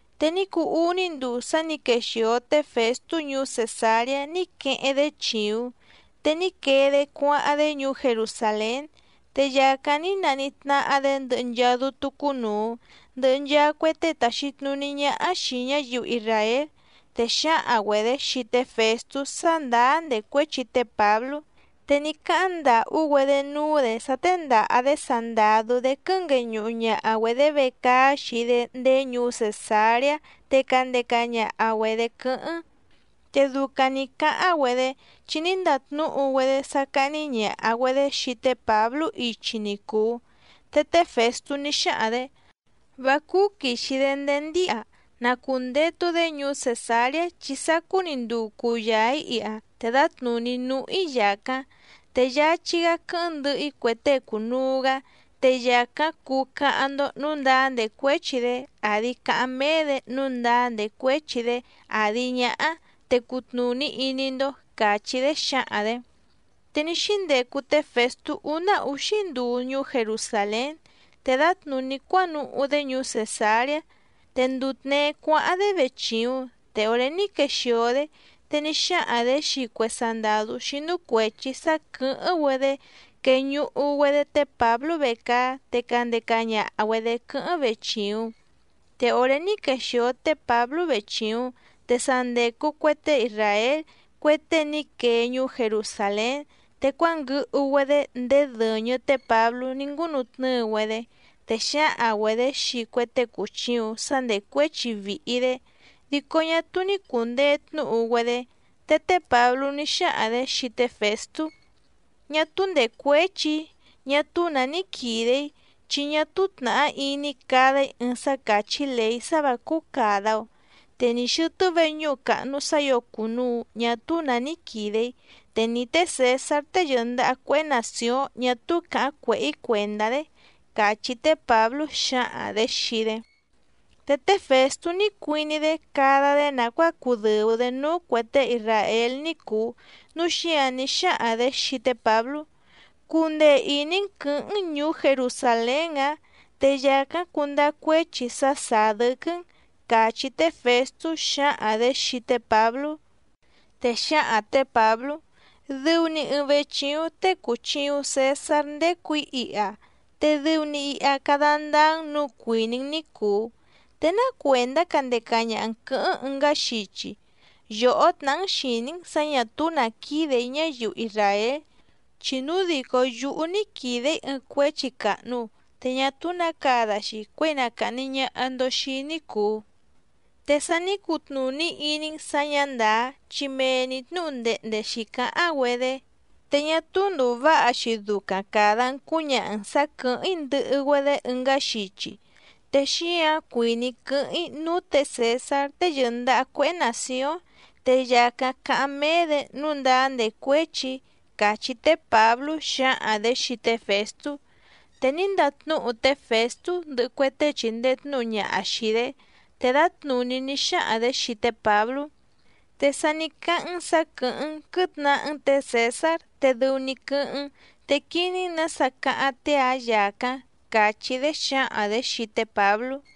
Te ní cuu úní nduu sá nǐ quexìo té Fèstú ñuú Cèsareá ní queheⁿ‑dé chìuⁿ, te ní quee‑dé cuáháⁿ‑dé ñuú Jerusàlén. Te yàcáⁿ ní naníhí tnáhá‑dě ndɨhɨ nchaa dútú cúnùu ndɨhɨ nchaa cue tée tàxi tnuní ñáhá xìi ñáyiu isràél, te xǎhaⁿ‑güedě xii té Fèstú sá ndàá ndècuéchi té Pǎblú. Te ní cáháⁿ ndàhú‑güedé núú‑dě sá téndàha‑dé sandàdú‑dé quɨ́ngueñuhu ñaha‑güedě vecaá xii‑dé ndéé ñuú Cèsareá te candeca ñaha‑güedě quɨ́hɨ́ⁿ. Te ducaⁿ nǐ cáháⁿ‑güedé, chi ní ndatnúhu‑güedé sá cáhní ñàha‑güedé xii té Pǎblú ichi ni cùu. Te té Fèstú ní xáhaⁿ‑dě: —Vá cúú quìxi‑dé ndéé ndíha. Na cùndetu‑dé ñuú Cèsareá chi sacú‑ni nduu cuyaa‑ǐ iha te dǎtnùní núhú‑í yàcáⁿ. Te yáchí‑gá quɨ́hɨ́ⁿ ndɨhɨ‑í cue tée cùnuu‑gá, te yàcáⁿ cuu cáháⁿ‑ndó nǔu ndáá ndècuéchi‑dé àdi cáháⁿ méé‑dě nǔu ndáá ndècuéchi‑dé àdi ñáhá, te cutnùní iní‑ndó —càchí‑dé xǎhaⁿ‑dě. Te ní xíndecu té Fèstú úná úxí nduu ñuú Jerusàlén, te dǎtnùní cuánuhú‑dé ñuú Cèsareá. Te nduu tněé cuáháⁿ‑dé vechìuⁿ, te òré ní quexìo‑dé, te ní xáhaⁿ‑dě xii cue sandàdú xínú cuèchi sá quɨ̀hɨ́ⁿ‑güedé queñuhu‑güedé té Pǎblú vecaá te candeca ñaha‑güedě quɨ́hɨ́ⁿ vechìuⁿ. Te òré ní quexìo té Pǎblú vechìuⁿ, te sa ndècu cue tée isràél cue tée ní quee ñuú Jerusàlén, te cuánguɨhu‑güedé ndéé dɨ̀ñɨ té Pǎblú ní ngúnutnɨ́ɨ‑güedé, te xǎhaⁿ‑güedě xii cue tée cùchiuⁿ sá ndècuéchi vìhi‑dé, dico ñá túú ní cùndee tnúhu‑güedé. Te té Pǎblú ní xáhaⁿ‑dě xii té Fèstú: —Ñá túú ndècuéchi‑í, ñá túú nǎ ní quìde‑í, chi ñá túú tnàhá iní‑í cada‑í ɨɨⁿ sá càchí lèí sá vǎ cúú càda‑o. Te ni xɨ̀tɨ́ veñúhu càhnu sá ǐo cùnuu ñá túú nǎ quídè‑í, te ni té Cèsár tée yɨ̀ndaha cuéhé nàcióⁿ ñá túú càháⁿ cuèhé‑í cuèndá‑dé —càchí té Pǎblú xǎhaⁿ‑dě xii‑dé. Te té Fèstú ní cuiní‑dé cada‑dé nàcuáa cudɨ̀u‑dé núú cuè tée isràél ní cùu, núu xíǎⁿ ní xáhaⁿ‑dě xii té Pǎblú: —¿Cundee ìní‑n quɨ̌hɨ́ⁿ‑n ñùú Jerusàlén‑ǎⁿ? Te yàcáⁿ cundáá cuéchi sá sàá dɨ́quɨ́‑n —càchí té Fèstú xǎhaⁿ‑dě xii té Pǎblú. Te xǎhaⁿ tě Pǎblú: —Dɨu‑ni ɨɨⁿ vechìuⁿ tée cùchiuⁿ Cesár ndécù‑í iha, te dɨu‑ni iha cada ndáá‑n nǔu cuìní‑n ní cùu. ¿Te ná cuèndá candeca ñaha‑n quɨ̌hɨ́ⁿ ɨngá xichi? Yòhó tnàhá‑n xìní‑n sǎ ñà túú nǎ quídè‑í ñáyiu isràél. Chi núu dìcó yúhú ní quìde‑í ɨɨⁿ cuéchi càhnu, te ñá túú nǎ cada‑xi cuěi na càhni ñaha‑ndo xii‑í ní cùu. Te sa ní cutnùní iní‑n sǎ ñǎ ndàá, chi mee‑ni tnǔhu ndehnde xǐcáháⁿ‑güedé, te ñá túú ndùu váha‑xi ducaⁿ càda‑n cúñaha‑n sǎ quɨ̀hɨ́ⁿ‑í ndɨhɨ‑güedé ɨngá xichi. Te xíǎⁿ cuìní‑í quɨ́hɨ́ⁿ‑í núú tě Cèsár tée yɨ̀ndaha cuéhé nàcióⁿ, te yàcáⁿ cáháⁿ méé‑dě nǔu ndáá ndècuéchi‑í —càchí té Pǎblú xǎhaⁿ‑dě xii té Fèstú. Te ní ndatnúhu té Fèstú ndɨhɨ cue tée chìndee tnúhu ñaha xìi‑dé, te dǎtnùní ní xáhaⁿ‑dě xii té Pǎblú: —Te sa ní cáháⁿ‑n sǎ quɨ̀hɨ́ⁿ‑n quɨ̌tnahá‑n tě Cèsár te dɨu‑ni quɨ́hɨ́ⁿ‑n, te quiní‑n nǎsa cáháⁿ tée‑ǎⁿ yàcáⁿ —càchí‑dé xǎhaⁿ‑dě xii té Pǎblú.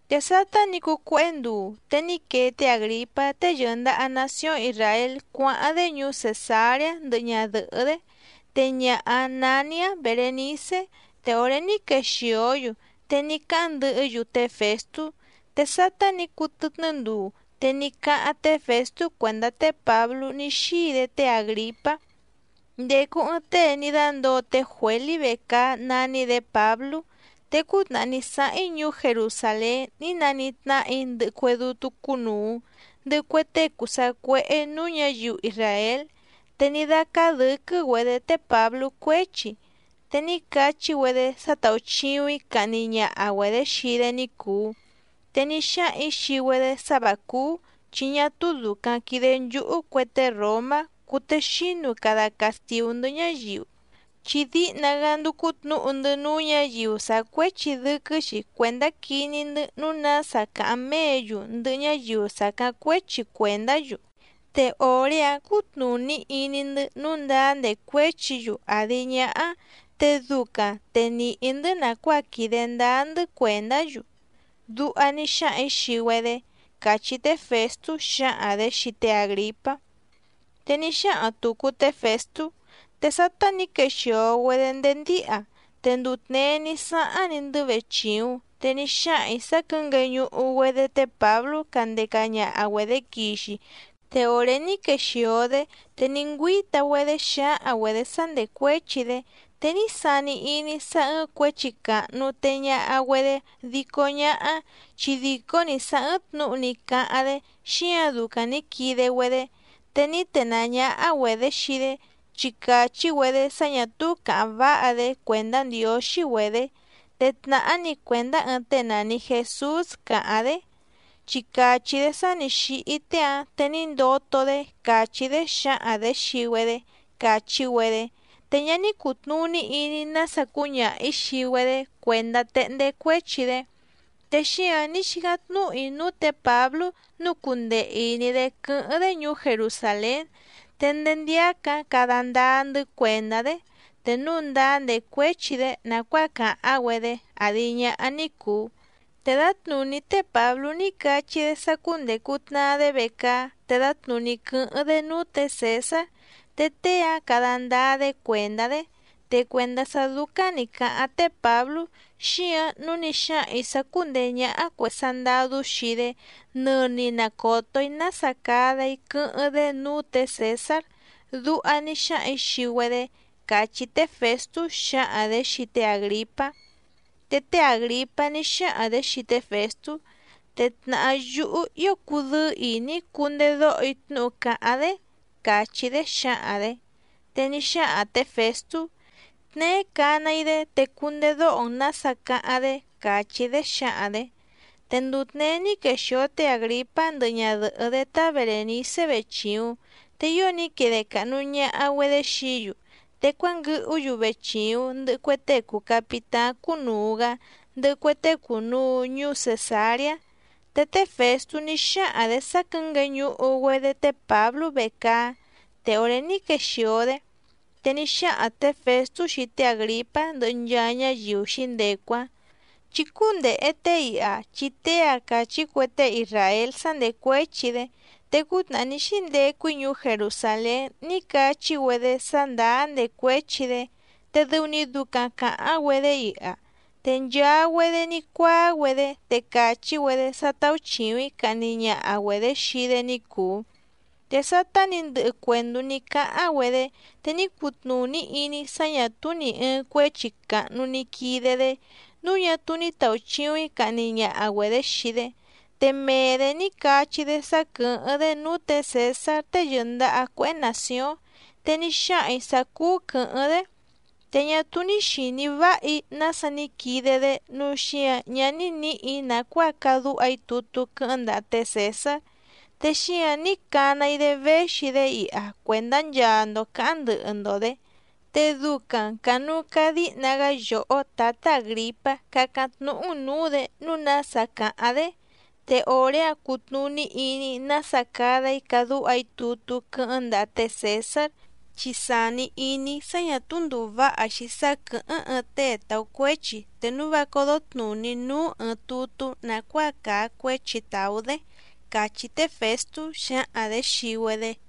Te sátá nǐ cuu cuéhé nduu, te ní quee té Àgripá tée yɨ̀ndaha nacióⁿ Isràél cuáháⁿ‑dé ñuú Cèsareá ndɨhɨ ñadɨ̀hɨ́‑dé, te ñaha‑áⁿ nání‑áⁿ Berènicé te òré ní quexìó‑yu, te ní cáháⁿ ndɨhɨ́‑yu té Fèstú. Te sátá nǐ cuu tɨtnɨ́ nduu, te ní cáháⁿ té Fèstú cuèndá té Pǎblú ní xíi‑dé té Àgripá: —Ndècu ɨɨⁿ tée ní dándǒo té Juělí vecaá nání‑dě Pǎblú. Te cútnàhá ní sáháⁿ‑í ñuú Jerusàlén ní nanítnáhà‑í ndɨhɨ cue dútú cúnùu ndɨhɨ cue tée cùu sacuéhé nǔú ñǎyiu isràél. Te ní dácáá dɨ̌quɨ́‑güedě té Pǎblú cuéchi, te ní cachí‑güedé sá táúchìuⁿ‑í cahni ñaha‑güedě xii‑dé ní cùu. Te ní xáhaⁿ‑ǐ xii‑güedé sá vǎ cúú, chi ñá túú dùcaⁿ quide nchúhú cue tée ròmá cùtexínu cada castìú‑ndɨ́ ñáyiu, chi díhna‑gá ndúcú tnǔhu‑ndɨ́ núú ñǎyiu sàá cuéchi dɨ́quɨ́‑xi cuèndá quiní‑ndɨ́ nǔu nása cáháⁿ méě‑yu ndɨhɨ ñáyiu sàcáⁿ cuéchi cuèndá‑yu, te òré‑áⁿ cútnùní iní‑ndɨ́ nǔu ndáá ndècuéchi‑yu àdi ñáhá, te ducaⁿ te nìhí‑ndɨ́ nàcuáa quìde ndáá‑ndɨ́ cuèndá‑yu, duha ní xáhaⁿ‑ǐ xii‑güedé —càchí té Fèstú xǎhaⁿ‑dě xii té Àgripá. Te ní xáhaⁿ tùcu té Fèstú: —Te sátá nǐ quexìo‑güedé ndéé ndíha, te nduu tněé ní sáháⁿ‑ni‑ndɨ́ vechìuⁿ. Te ní xáhaⁿ‑ǐ sá quɨ̌ngueñuhu‑güedé té Pǎblú candeca ñaha‑güedě quixi, te òré ní quexìo‑dé, te ní ngüíta‑güedé xǎhaⁿ‑güedě sá ndècuéchi‑dé. Te ní sani iní‑í sá ɨ́ɨ́ⁿ cuěchi càhnu tee ñaha‑güedé dico ñáhá, chi dìcó‑ni sá ɨ́ɨ́ⁿ tnǔhu ní cáháⁿ‑dé, xíǎⁿ ducaⁿ nǐ quide‑güedé. Te ní tenàá ñáhá‑güedě xii‑dé, chi càchí‑güedé sá ñà túú càháⁿ váha‑dé cuèndá ndiǒxí‑güedě. Te tnàhá‑ni cuèndá ɨɨⁿ tée nàni Jesús càháⁿ‑dé, chi càchí‑dé sá nǐ xíhí tée‑áⁿ te ní ndoto‑dé càchí‑dé xǎhaⁿ‑dě xii‑güedé, càchí‑güedé. Te ñá ní cùtnuní iní‑í nása cúñaha‑ǐ xii‑güedé cuèndá téhndé cuéchi‑dé. Te xíǎⁿ ní xícáⁿ tnúhu‑í núú tě Pǎblú nǔu cundee ìní‑dé quɨ́hɨ́ⁿ‑dé ñuú Jerusàlén, te ndéé ndíácǎⁿ cada ndáá‑ndɨ́ cuèndá‑dé, te núu ndáá ndècuéchi‑dé nàcuáa càháⁿ‑güedé àdi ñáhá ní cùu. Te dǎtnùní té Pǎblú ní cachí‑dé sá cúndècu tnaa‑dé vecaá te dǎtnùní quɨ́hɨ́ⁿ‑dé núú tě Cèsár, te tée‑áⁿ cada ndáá‑dé cuèndá‑dé. Te cuèndá sá dúcáⁿ nǐ cáháⁿ té Pǎblú, xíǎⁿ nǔu ní xáhaⁿ‑ǐ sá cúndèé ñáhá cuè sandadú xii‑dé, nɨni na còto‑í nása cada‑í quɨ́hɨ́ⁿ‑dé núú tě Cèsár, duha ní xáhaⁿ‑ǐ xii‑güedé —càchí té Fèstú xǎhaⁿ‑dě xii té Àgripá. Te té Àgripá ní xáhaⁿ‑dě xii té Fèstú: —Te tnàhá yúhú ío cudɨ́ɨ́ ìní‑í cundedóho‑í tnúhu càháⁿ‑dé —càchí‑dé xǎhaⁿ‑dě. Te ní xáhaⁿ tě Fèstú: —Tneé cana‑í‑dé te cundedóho‑n nǎsa cáháⁿ‑dé —càchí‑dé xǎhaⁿ‑dě. Te nduu tněé ní quexìo té Àgripá ndɨhɨ ñadɨ̀hɨ́‑dé tá Berènicé vechìuⁿ, te ío ní quide càhnu ñaha‑güedé xií‑yu. Te cuánguɨhú‑yu vechìuⁿ ndɨhɨ cue tée cùu capitáⁿ cúnùu‑gá ndɨhɨ cue tée cùnuu ñuú Cèsareá. Te té Fèstú ní xáhaⁿ‑dě sá quɨ̌ngueñuhu‑güedé té Pǎblú vecaá, te òré ní quexìo‑dé, te ní xáhaⁿ tě Fèstú xii té Àgripá ndɨhɨ nchaa ñáyiu xǐndecu‑áⁿ: —Chí cúndèhe tée iha chi tée‑a càchí cue tée isràél sá ndècuéchi‑dé, te cútnàhá ní xíndecu‑í ñuú Jerusàlén ní cachí‑güedé sá ndàá ndècuéchi‑dé, te dɨu‑ni ducaⁿ càháⁿ‑güedé iha. Te nchaa‑güedé ní cuáá‑güedé te càchí‑güedé sá táúchìuⁿ‑í cahni ñaha‑güedě xii‑dé ní cùu. Te sátá nǐ ndɨhɨ cuèndú ní cáháⁿ‑güedé, te ní cutnùní iní‑í sá ñà túú nì ɨɨⁿ cuéchi càhnu ni quide‑dé, núu ñá túú ní tàuchiuⁿ‑í cahni ñaha‑güedě xii‑dé. Te mee‑dě ní cachí‑dé sá quɨ̀hɨ́ⁿ‑dé núú tě Cèsár tée yɨ̀ndaha cuéhé nàcióⁿ, te ní xáhaⁿ‑ǐ sá cúú quɨ̌hɨ́ⁿ‑dé. Te ñá túú ní xìní váha‑í nása ní quide‑dé, núu xíǎⁿ ñá ní nǐhì‑í nàcuáa cadúha‑í tutú quɨ́hɨ́ⁿ ndaha té Cèsár, te xíǎⁿ ní cana‑í‑dé véxi‑dé iha cuèndá nchaa‑ndo cǎháⁿ ndɨhɨ‑ndo‑dě. Te ducaⁿ cànuu cadíhna‑gá yòhó tǎtá Àgripá cácáⁿ tnúhú‑n nǔú‑dě nǔu nása cáháⁿ‑dé, te òré‑áⁿ cutnùní iní‑í nása cada‑í cadúha‑í tutú quɨ́hɨ́ⁿ ndaha té Cèsár. Chi sàni iní‑í sá ñà túú ndùu váha‑xi sá quɨ̀hɨ́ⁿ ɨɨⁿ tée tàú cuéchi te núu vá códó tnùní núú ɨɨⁿ tutú nàcuáa càa cuéchi tàú‑dé —càchí té Fèstú xǎhaⁿ‑dě xii‑güedé.